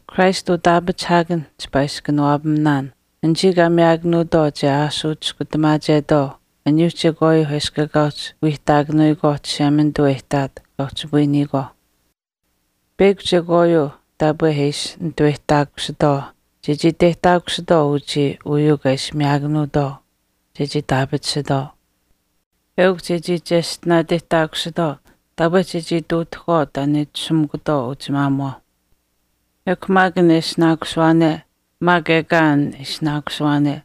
Christ utaapachihaakanh chipaa ishi kanawaapaminaan, anichii kaa miyaakanuutwaau che aashuu chiskutamaachetwaau aniyuu chekwaayuuh eshkw ekaa uhchi wiihtaakanuyikwaauh, aniyuuh Chishemanituuh e ihtaat kaa uhchipayiniyikwaauh. Peyakw chekwaayuu taapwe e ishi nituweyihtaakusitwaau chechii iteyihtaakusitwaau uchii uyuu kaa ishi miyaakanuutwaau chechii itaapatisitwaau eukw chechii cheshtinaateyihtaakusitwaau taapwe chechii ihtuutahkwaau taan e itashumikutwaau uchimaamuwaauh. Ekw maak an e ishinaakusuwaane maak ekaa an e ishinaakusuwaane,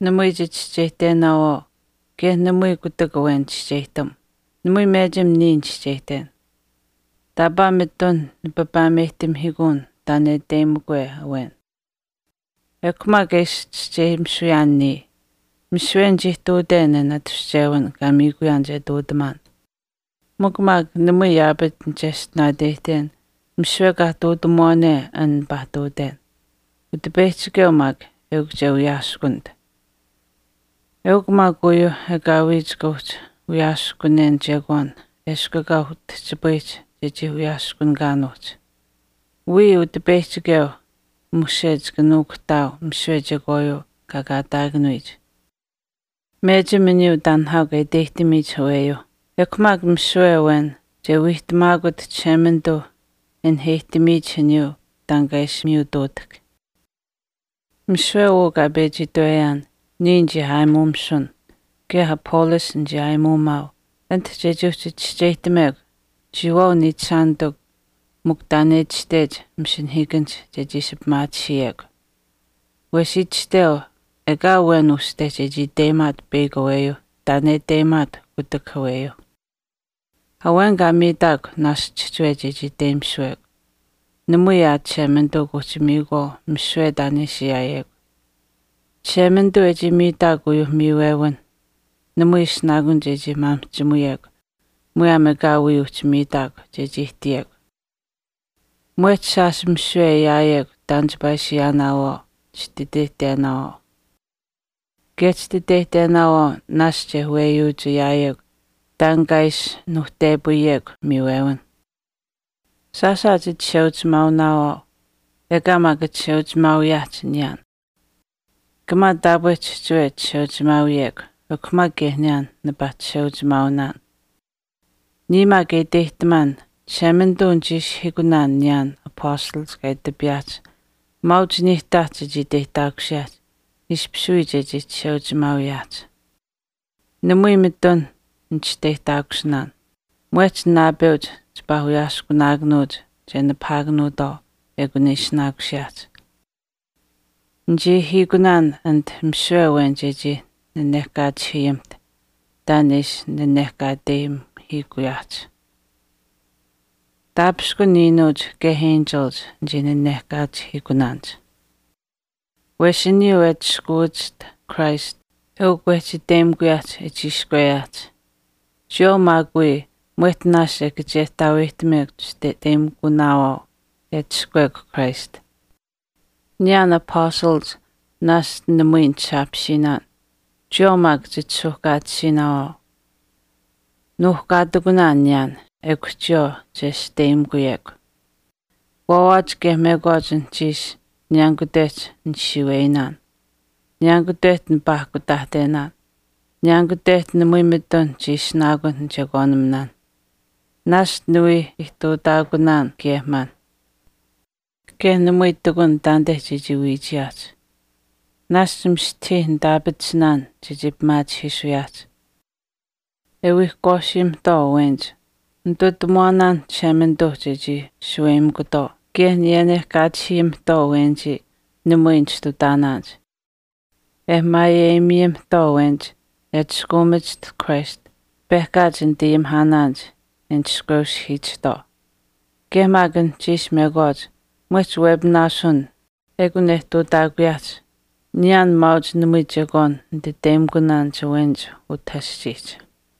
namui chichischeyihtenaawaau kaye namui kutak awen chischeyihtam. Namui mechim niya nichischeyihten. Taapaa mitun nipapaameyihtamihiikuun taan e iteyimikwe awen. Ekw maak e ishi chischeyimisuyaan niya, misiwe nichii ihtuuten an atushchewin kaa miikuyaan che ihtuutamaan. Mikw maak namui yaapach nicheshtinaateyihten misiwe kaa ihtuutamuwaane an nipaa ihtuuten. Utipeyihchikeu maak eukw che wiyaaskunit. Eukw maak uu uhchi ekaawii chika uhchi wiyaaskunen chekwaan eshkw ekaa utihchipayihch chechii wiyaaskunikanuuhch. Wiya Utipeyihchikeu mushe chika nuukuhtaau misiwe chekwaayuu kaa kaataakanuyich. Mechim aniyuu taan nihaau kaa iteyihtamiyich aweyuuh. Ekw maak misiwe awen che wiihtamaakut Chishemanituu e naheyihtamiyich aniyuu taan kaa ishi miyutuutahk. Misiwe uu kaa pechi itweyaan niya nichii aayimuumisun kaye Apollos nichii aayimuumaau anit chechii uhchi chischeyihtamekw chiyawaau niichishaanitikw mikw taan e itashtech masinahiikanihch chechii ishi pimaatisiyekw. Wesh itashteu ekaa awen uste chechii iteyimaat peyakw aweyuu taan e iteyimaat kutak aweyuuh. Awen kaa miitaakw naashch chihchiwe chechii iteyimisuwekw. Namui aa Chishemanituu kuuhchi miikuwaau misiwe taan e ishi ayaawekw. Chishemanituu e chii miitaakw uyuuh miiwewinh namui ishinaakun chechii maamihchimuyekw muyaam ekaa wii uhchi miitaakw chechii ihtiyekw. Mwehch shaash misiwe e ayaayekw taan chipaa ishi ayaanaawaau chititeyihtenaawaau. Kaye chititeyihtenaawaau naashch e weyuuch ayaayekw taan kaa ishi nuuhtepayiyekw miiwewinh. Chichisheuchimaaunaawaau aa, ekaa maak chisheuchimaawiyaahch niyaan. Kamaa taapwe chihchiwe chisheuchimaawiyekw ekw maak kaye niyaan nipaa chisheuchimaaunaan. Niya maak e iteyihtamaan Chishemanituu nichii ishihiikunaan niyaan apastalach kaa itapiyaahch maauch niihtaach chechii iteyihtaakusiyaahch ishpish wii chechii chisheuchimaawiyaahch. Namui mitun nichisteyihtaakusinaan. Muyaam naapeuch chipaa wiyaaskunaakanuuch che nipahaakanuutwaau ekun e ishinaakusiyaahch. Nichii ahiikunaan anit misiwe awen chechii naanaakachihiyimiht taan e ishi nanehkaateyimuhiikuyaahch. Taapishkun iinuuch kaye enchilich ninaanaakachihiikunaanich. Wesh aniyuu e atushkuwachiht Christ, eukw wehchi iteyimikuyaahch e chiishkweyaahch. Chiyawaau maak wii mwehch naashch e kachehtaaweyihtamekw chititeyimikunaawaau e atushkuwekw Christ. Niyaan apastalach naashch namui nisaapisiinaan, chiyawaau wii maak chisuuhkaatisiinaawaau chiyawaau. Nuuhkaatikunaan niyaan. Chiyawaau maak chichisteyimikunaawaau chiyawaau. Waawaach kaye mekwaach anuhchiish niyaanikutehch nisiiweyinaan. Niyaanikutehch nipaakutaahtenaan. Niyaanikutehch namui mitun chii ishinaakun nichekwaaniminaanh. Naashch niwii ihtuutaakunaan kaye maanh. Kaye namui ihtakun taanite chechii wiichiyaahch. Naashch mistahii nitaapatisinaan chechii pimaachihiisuyaahch. E wiihkwaasiyimihtwaau awenich, nitutamuwaanaanh Chishemanituuh chechii shaweyimikutwaau. Kaye niyenehkaachihiyiamihtwaauh awenich namui nichistutaanaanich. E maayeyimiyamihtwaau awenich e atushkaamachiht Christ, pehkaach nitayimihaanaanich e nishkweuhiichihtwaauh. Kaye maak anuhchiish mekwaach mwehch wepinaasun ekun e ihtuutaakuyaahch, niyaan maauch namui chekwaan nititeyimikunaanich awenich utah aschiihch.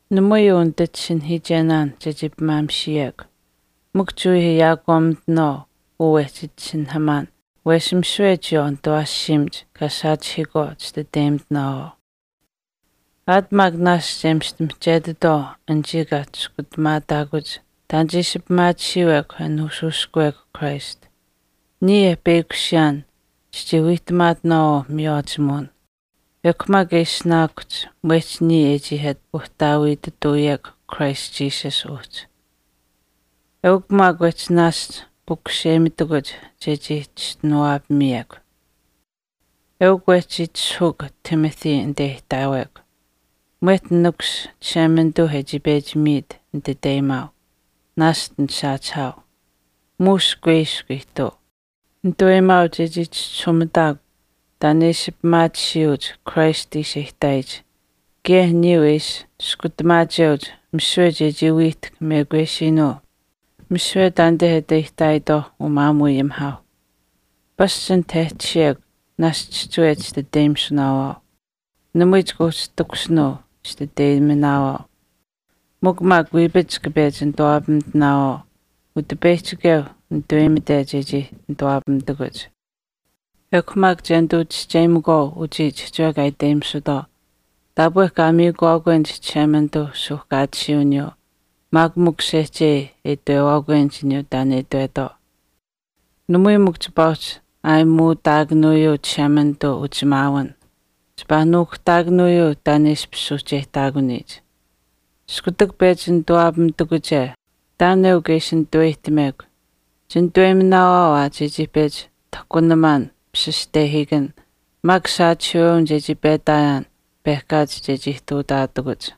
Namui uu nititisinahiichen chechii pimaamishiyekw. Mikw chiwii ayaakwaamimitinaawaau uu wehchi itisinahamaan wesh misiwe chiyawaau nitawaashiimach kaa saachihiikwaau chititeyimitinaawaau. Aat maak naashch e mista mihchetitwaau anichii kaa chiskutamaataakuch e waawiihtamaataakuch taan che ishi pimaatisiiwekw e nuushuushkuumekw Christ. Niya e peyakushiyaan chichii wiihtamaatinaawaau miywaachimuwin. Ekw maak e ishinaakuhch mwehch niya e chii ati uhtaawiitutuuyekw Christ Jesus uhchi. Eukw maak wehchi naashch pukuseyimitakuch chechii chischinuwaapamiyekw. Eukw wehchii itishahuuk Timothy anite e itaawekw. Mwehch nikus Chishemanituu e chii pechi miit nititeyimaau, naashch nisaachihaau. Muush kuiskw ihtuu. Nitaweyimaau chechii chischisuumitaakw taan e ishi pimaatisiyuuch Christ ishi e ihtaayich kaye aniyuu e ishi chiskutamaacheuch misiwe chechii wiihtahk mekwesiinuu misiwe taanite e ati aihtaayitwaauh umaamuuayimihaauh. Pasch anit e tashiyekw naashch chihchiwe chititeyimisunaawaau. Namui chika uhchi takushin chititeyiminaawaau. Mikw maak wiipach chika pechi nituwaapamitinawaau, Utipeyihchikeu nituweyimite chechii nituwaapamitakuch. Ekw maak che nituu chischeyimakwaau uchii chihchiwe kaa iteyimisutwaau taapwe kaa miikuwaakwenich Chishemanituuh suuhkaatisiiwiniyuu maak mikw sehchei e itwewaakwenich aniyuu taan e itwetwaau. Namui mikw chipaa uhchi ayimitutaakanuuyuu Chishemanituu uchisheuchimaawin, chipaa nuukuhtaakanuuyuu taan e ishpish suuhcheyihtaakuniyich. Iskutak pechi nituwaapamitakuche taan eukw e ishi nituweyihtamekw. Chinituweyiminaawaau aa chechii pechi tahkunamaan pishishtehiikan maak saachihiiwewin chechii petaayaan pehkaach chechii ihtuutaatakuch.